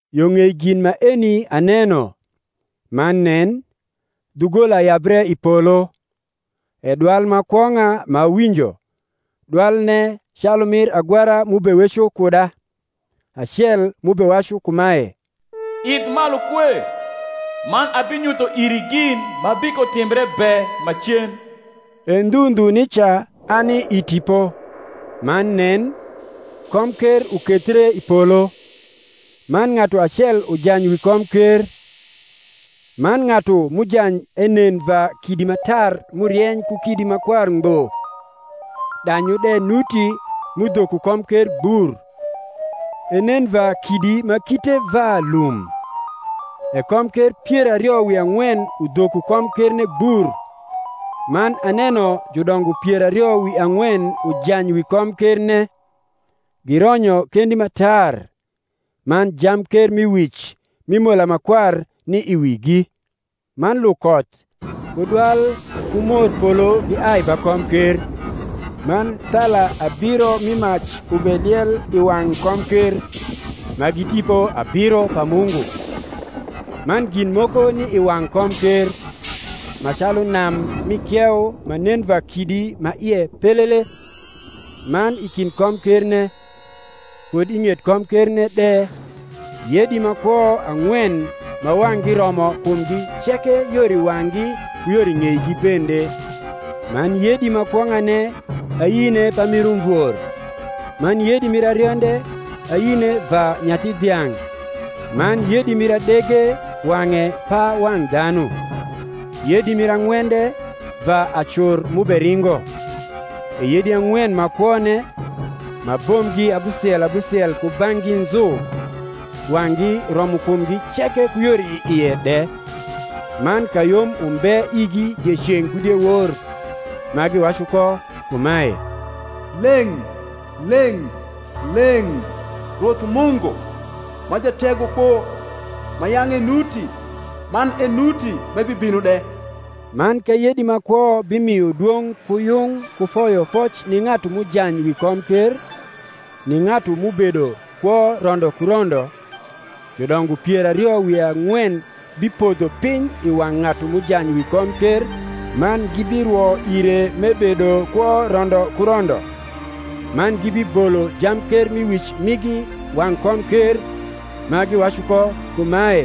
Yo ng’ei gin maeni aneno, man nen, dhugola yabre i polo, e dwal ma kwong’a m’awinjo, dwalne calu mir agwara m’ubeweco kuda, acel m’ubewacu kumae, Idh malu kue, man abinyutho iri gin ma bikotimbre be macen. E ndhu ndhu nica ani i Tipo. man nen, komker ukethie i polo, man ng’atu acel ujany wi komker; man ng’atu m’ujany enen va kidi ma tar m’urieny ku kidi ma kwar ngbo, danyu de nuti m’udhoko komker gbur, enen va kidi ma kite va lum. E komker pier ario wi ang’wen udhoko komkerne gbur; man aneno judongo pier ario wi ang’wen ujany wi komkerne, gironyo kendi ma tar; man jamkermiwic mi mola ma kwar ni i wigi. Man lukoth ku dwal ku morpolo giai ba komker. Man thala abiro mi mac ubeliel i wang’ komker, ma gi Tipo abiro pa Mungu; man gin moko ni i wang’ komker, ma calu nam mi kieu ma nen va kidi ma ie pelele; man i kind komkerne, kud i ng’et komkerne de, yedi ma kwo ang’wen ma wang’gi romo kumgi ceke yor i wang’gi ku yor i ng’eigi bende. Man yedi ma kwong’ane ayine pamir umvor, man yedi mir arionde ayine va nyathi dhiang’, man yedi mir adege wang’e pa wang’ dhanu, yedi mir ang’wende va acur m’uberingo. E yedi ang’wen ma kwone, ma bombgi abusiel abusiel kubang’gi nzu, wang’gi romo kumgi ceke ku yor i ie de: man kayom umbe igi dieceng’ ku diewor, ma giwacu ko kumae, Leng’, leng’, leng’, Rwoth Mungu, ma Jategokpo, ma yang’ enuti man enuti m’ebibino de. Man ka yedi ma kwo bimio dwong’ ku yung ku foyofoc ni ng’atu m’ujany wi komker, ni ng’atu m’ubedo kwo rondo ku rondo, judongo pier ario wi ang’wen bipodho piny i wang’ ng’atu m’ujany wi komker, man gibirwo ire m’ebedo kwo rondo ku rondo, man gibibolo jamkermiwic migi wang’ komker, ma giwacu ko kumae,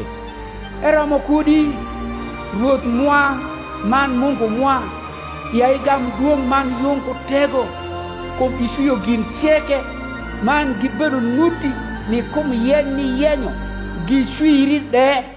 Eromo kudi, Rwoth mwa man Mungu mwa, ya igam dwong’ man yung ku tego: kum icwio gin ceke, man gibedo nuti ni kum yeny m’iyenyo, gicwiri de.